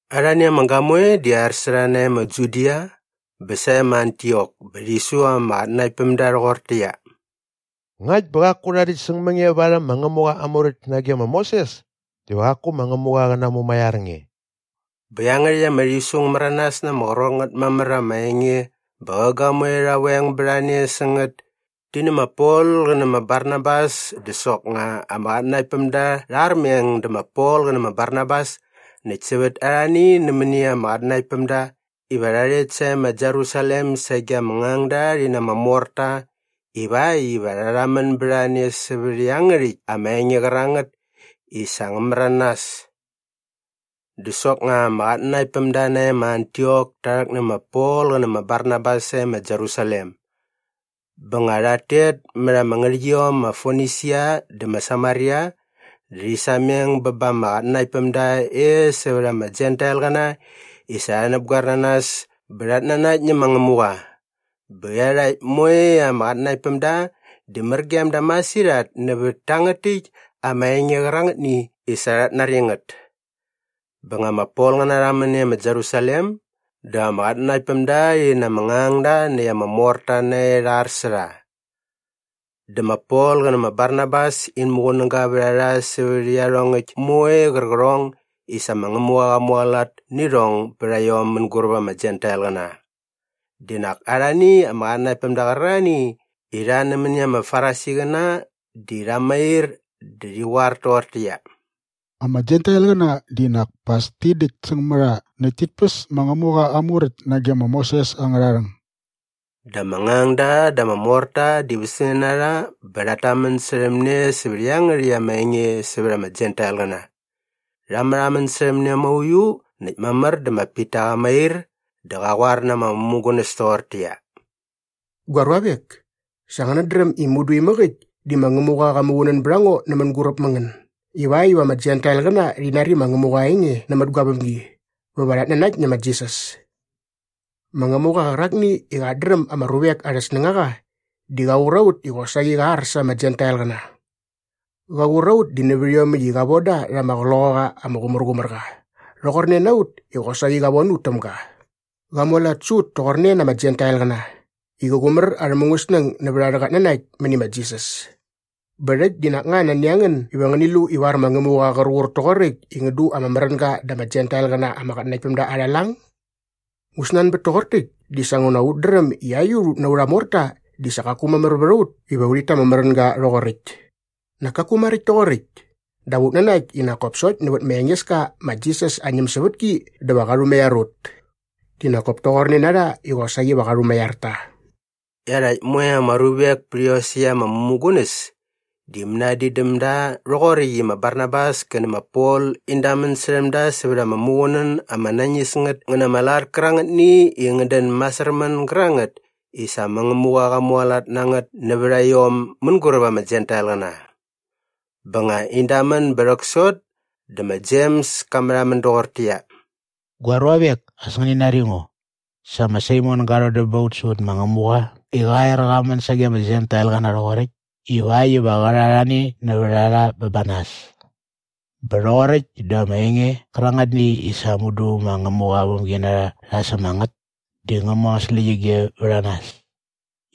Arhani ama gamoe di ar sä rha nae ma Judia bä sae ma Antiok bä rhi su ama qatnanaktpämda rhoqortäqyia, “Ngakt bä qaku rha däkt säng mä nge varhäm ma Ngämuqa aa Muräkt nage ma Moses diva qaku ma Ngämuqa qä namumaiar nge.” Bä iangärhäkt ama rhisu ngä märanas na ama qrot ngät mamär ama enge bä qä gamoe rha veng bät a ne sä ngät ti nä ma Pol qä nä ma Barnabas dä soknga ama qatnanaktpämda rha armeng dä ma Pol qä nä ma Barnabas näkt sävät arhani nämäni ama qatnanaktpämda iva rha rhet sae ma Jerusalem sage ama ngangda rhi na ama morta ivakt iva rha rhamän bät a ne sävät iangärhäkt ama enge qärangät i sa ngä märanas. Dä soknga ama qatnanaktpämda nae ma Antiok ta rhäk nä ma Pol qä nä ma Barnabas sae ma Jerusalem. Bä nga rhat tet mät ama ngärhäqyiom ma Fonisia dä ma Samaria dä rhi sameng bä ba ama qatnanaktpämda e sävät ama Jentailqäna i sa rha näpgoer na nas bä rhat nanakt nä ma Ngämuqa. Bä iarhakt moe ama qatnanaktpämda di mär gem da masirhat nävät tangät täkt ama enge qärangätni i sa rhat nari ngät. Bä nga ma Polqäna rha män e ma Jerusalem dä ama qatnanaktpämda rhi na ama ngangda näkt ama morta nae rha ar sä rha. Dä ma Pol qä nä ma Barnabas in muqunäga vät a rha sävät iarhongäkt moe qärqärhong i sa ma Ngämuqa qa mualat nä irhong bät a iom mänguräp ama Jentailqäna. Di nak arhani ama qatnanaktpämda qärarhani i rha nämäni ama Farisiqäna di rha mair dä rhi qoar toqortäqyia, “Ama Jentailqäna di nak pa as ti däktsäng mä rha näkt tit päs ma Ngämuqa aa Muräkt nage ma Moses angärha rhäng.” Dä ama ngangda dä ama morta di västämne na rha bä rhat tamän särhäm ne sävät iangärhäkt ama enge sävät ama Jentailqäna. Rha märhamän särhäm ne mauiu näkt mamär dä ma Pita qa mair dä qa qoar na ama mämugunäs toqortäqyia, “Gua ruavek, sa ngänät dräm i mudu imäk äkt di ma Ngämuqa qa muqunän bät a ngo nä mänguräp mä ngän ivakt iva ama Jentailqäna rhi nari ma Ngämuqa aa enge nämät gua vämgi bä va rhat nanakt nä ma Jisas. Ma Ngämuqa qärakni i qat dräm ama ruvek arhä snängaqa di qa qur a ut i qosaqi sa qa ar sa ama Jentailqäna. Qa qur a ut di nä iomäkt i qa von da rha ama Qloqaqa ama Qumärqumärqa rhoqorne na ut i qosaqi qa von ut täm ga. Qa mualat sä ut toqorne na ama Jentailqäna i qä qumär arhä mungäsnäng nävät arhä qatnanakt mäni ma Jisas. “Bä rhäkt di nak nga nani a ngän iva ngäni lu ivar ma Ngämuqa qär qur toqoräkt i ngän du ama märänga da ama Jentailqäna ama qatnanaktpämda arha lang? Ngu snanbät toqor täkt di sa nguna ut dräm i aiut ut na aurha morta di sa qaku mamär vät ut iva urhit ta ama märänga rhoqoräkt. Nak kaku maräkt toqoräkt! Dap ut nanakt i nak kop sokt nävät ma Engeska ma Jisas aa ñämsävätki dä va qa rhumaiar ut. Di nak kop toqorne na rha i qosaqi va qa rhumaiar ta.” Iarhakt moe ama ruvek pät iosäkt ama mämugunäs di mänadin däm da rhoqoräkt i ma Barnabas kä nä ma Pol in damän särhäm da sävät ama muqunän ama nañis ngät ngä na ama lat kärangätni i ngät dän masärmän gärangät i sa ma Ngämuqa qa mualat na ngät nävät a iom mänguräp ama Jentailqäna. Bä nga in damän bä rhäksot dä ma Jems ka märhamän doqortäqyia, “Gua ruavek, as ngäni nari ngo. Sa ma Saimon ga rhodäm ba ut sävät ma Ngämuqa i qa er qa män sage ama Jentailqäna rhoqoräkt ivakt iva qä rha arhani nävät a rha bä ba nas. Bä rhoqoräkt dä ama enge qärangätni i sa mudu ma Ngämuqa aa vämginarha rha säm a ngät di ngä mu angät släqyige vät a nas.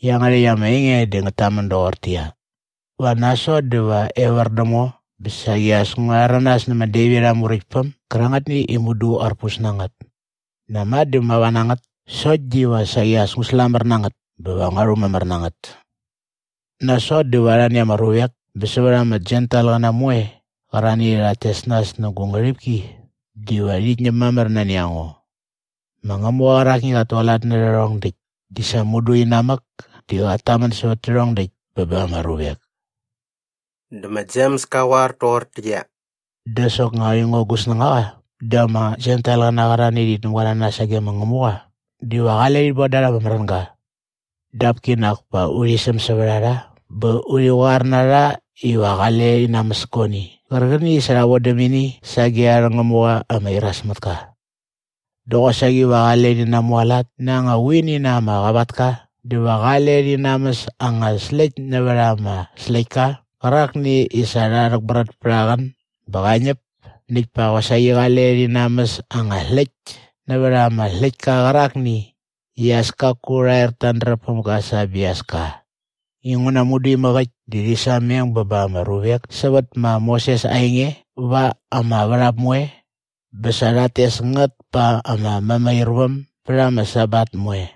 Iangärhäkt ama enge di ngät tamän doqortäqyia, “‘Va nasot dä va evär däm ngo bä saqi as ngua rhäranas nä ma Devit aa muräktpäm gärangätni i mudu arpus na ngät. Näma dä mava na ngät sokt diva saqi as ngu slamär na ngät bä va ngua rhumamär na ngät. Nasot dä va arhani ama ruvek bä sävät ama Jentailqäna moe qärarhani i rhat tes nas nä gu ngärhipki diva rhit ñäm mamär nani a ngo. Ma Ngämuqa qärakni i qat tualat nä rhärhong däkt di sa mudu inamäk di qat tamän sävät tärhong däkt bä ba ama ruvek.’” Dä ma Jems ka qoar toqortäqyia, “Dä soknga aingo gu snängaqa di ama Jentailqäna qärarhani i rhit näpgoer na nas sage ma Ngämuqa diva qale urhit bon da rha ama märänga. Dap kinak pa urhi säm sävät a rha bä urhi qoar na rha iva qale rhi namäs guani qärqäni i sa rha vodäm ini sage arhä ngämuqa ama iras mät ka. Dä qosaqi va qale rhi namualat na anga vuini na ama qavatka dä va qale rhi namäs anga släkt nävät ama släktka qärakni i sa rha rhäkbrät pät aa qän bä qa ñäp näkt pa qosaqi qale rhi namäs anga släkt nävät ama släktka qärakni i as kaku rha er ta andräp päm ga sa aa biaska. “Inguna mudu imäk äkt di rhi sameng bä ba ama ruvek sävät ma Moses aa enge va ama värhap moe bä sa rhat tes ngät pa ama mämairväm bät ama Sabat moe.”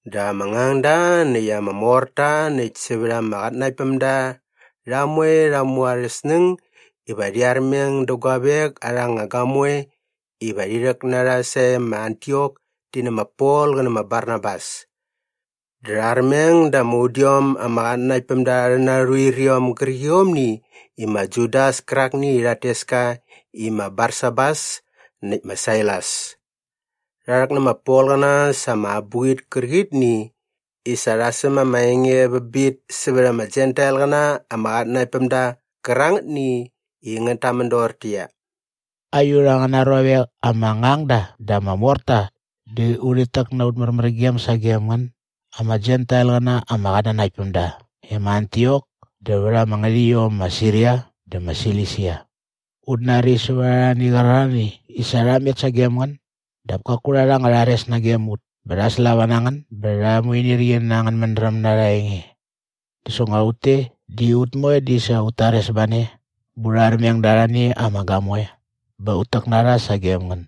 Dä ama ngangda näkt ama morta näkt sävät ama qatnanaktpämda rha moe rha mu arhä snäng iva rhi armeng dä guavek arha anga gamoe iva rhi rhäk na rha sae ma Antiok ti nä ma Pol qä nä ma Barnabas. Dä rha armeng da ama udiom ama qatnanaktpämda arhä narhuiriom gärqiomni i ma Judas kärakni i rhat tes ka i ma Barsabas näkt ma Sailas. Rha rhäk nä ma Polqäna sa ama abuqit kärqitni i sa rha säm ama enge vä bit sävät ama Jentailqäna ama qatnanaktpämda qärangätni i ngät tamän doqortäqyia, “Aiut angäna ruavek ama ngangda dä ama morta di urhit täk na aut märmärgem sagem ngän ama Jentailqäna ama qatnanaktpämda e ma Antiok dä vät ama ngärhäqyiom ma Siria dä ma Silisia. Ut nari sävät arhani qärarhani i sa rha met sagem ngän dap kaku rha rha anga rhares nagem ut bä rha slava na ngän bä rha muinirqi na angän mädräm na arha enge. Dä soknga ut te di ut moe di sa ut tares ba ne bä urha armeng da arhani ama gamoe bä ut täk na rha sagem ngän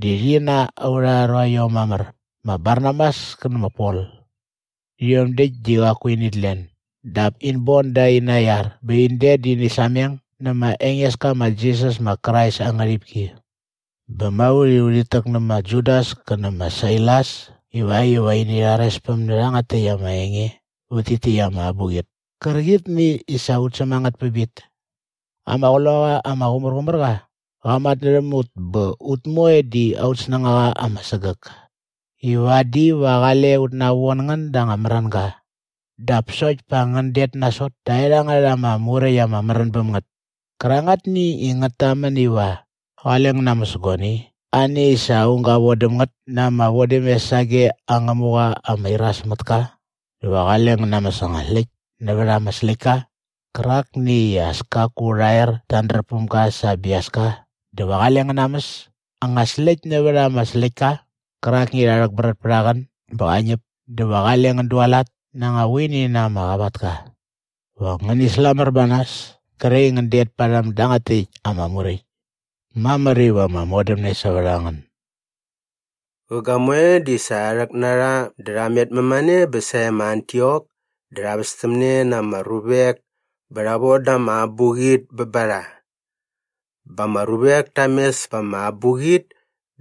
di rhi na aurha ruaiom mamär ma Barnabas kä nä ma Pol. Rhiom däkt di qaku init len dap in bon da aina iar bä in det dä ini sameng nä ma Engeska ma Jisas ma Krais aa ngärhipki. Bä ma ut i urhit täk nä ma Judas kä nä ma Sailas ivakt iva ini rharespäm nä rhangät täkt ama enge vät tit täkt ama abuqit kärqitni i sa ut säm a ngät pä bit. “Ama Qloqaqa ama Qumärqumärqa qa matnärhäm ut bä ut moe di aut snängaqa ama sägäk i vadi va qale ut navon ngän da anga märänga dap sokt pa ngän det nasot taerhangät ama muräkt ama märän bäm ngät kärangätni i ngät tamän iva qale ngän namäs guani ani i sa aung ga vodäm ngät na ama vodämes sage aa ngämuqa ama iras mät ka dä va qale ngän namäs anga släkt nävät ama släktka qärakni i as kaku rha er ta andräp päm ga sa aa biaska dä va qale ngän namäs anga släkt nävät ama släktka qärakni i rha rhäkbrät pät aa qän bä qa ñäp dä va qale ngän dualat na anga vuini na ama qavatka. Va ngäni slamär ba nas kre i ngän det parhäm dangät täkt ama muräkt. “Mamär iva ama modämne sävät a ngän.” Qä gamoe di sa rha rhäk na rha dä rha met mämane bä sae ma Antiok dä rha västämne na ama ruvek bä rha von da ama abuqit bä ba rha. Bä ama ruvek ta mes pa ama abuqit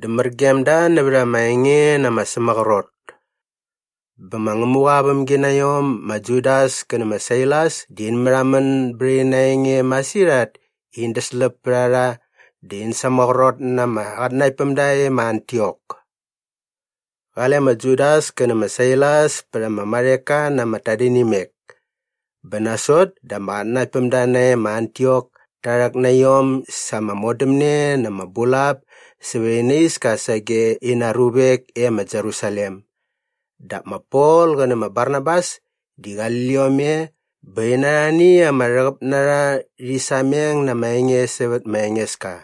dä mär gem da nävät ama enge na ama sämaqrot. Bä ma Ngämuqa aa vämginaiom ma Judas kä nä ma Sailas di in märhamän bät ina enge masirhat i in däsläp pät a rha dä in sämaqrot na ama qatnanaktpämda e ma Antiok. Qale ma Judas kä nä ma Sailas pät ama marheka na ama tadinimek. Bä nasot dä ama qatnanaktpämda nae ma Antiok ta rhäk na iom sa ama modämne na ama bulap sävät ina iska sage ina ruvek e ma Jerusalem. Dap ma Pol qä nä ma Barnabas di qali liom e bä in na arhani ama rhäqäp na rha rhi sameng na ama enge sävät ma Engeska.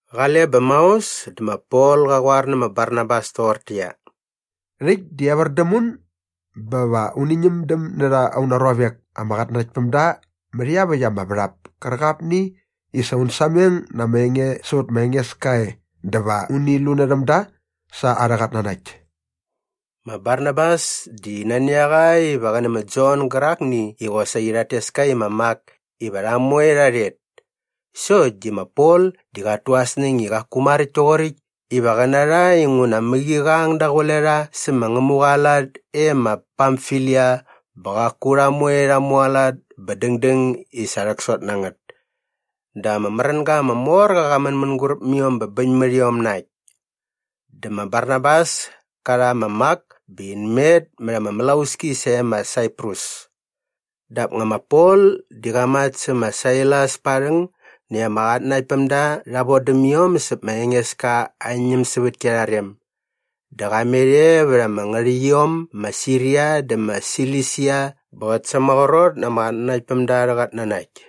Qale bä maos dä ma Pol qa qoar nä ma Barnabas toqortäqyia, “Rhäkt di evär däm un bä va uni ñämdäm närha auna ruavek ama qatnanaktpämda mät iaväkt ama värhap kärqapni i sa un sameng na ama enge sävät ma Engeska e dä va uni lunärhäm da sa arhä qatnanakt.” Ma Barnabas di nani a qa iva qä nä ma Jon gärakni i qosaqi rhat tes ka i ma Mak iva rha moe rha rhet sokt di ma Pol di qat tu aa snäng i qaku maräkt toqoräkt iva qä na rha inguna mäqi qa ang daqule rha sä ma Ngämuqa aa lat e ma Pamfilia bä qaku rha moe rha mualat bä dängdäng i sa rhäksot na ngät. Dä ama märänga ama mor qa qa män mänguräp mä iom bä bäñ mät iom na äkt. Dä ma Barnabas ka rha ma Mak bä in met mät ama mlauski sae ma Saiprus dap nga ma Pol di qa mat sä ma Sailas pa aa rhäng näkt ama qatnanaktpämda rha vodäm iom säp ma Engeska aa ñämsävätki arha rem. Dä qa met e vät ama ngärhäqyiom ma Siria dä ma Silisia bä qät sämaqrot na ama qatnanaktpämda arhä qatnanakt.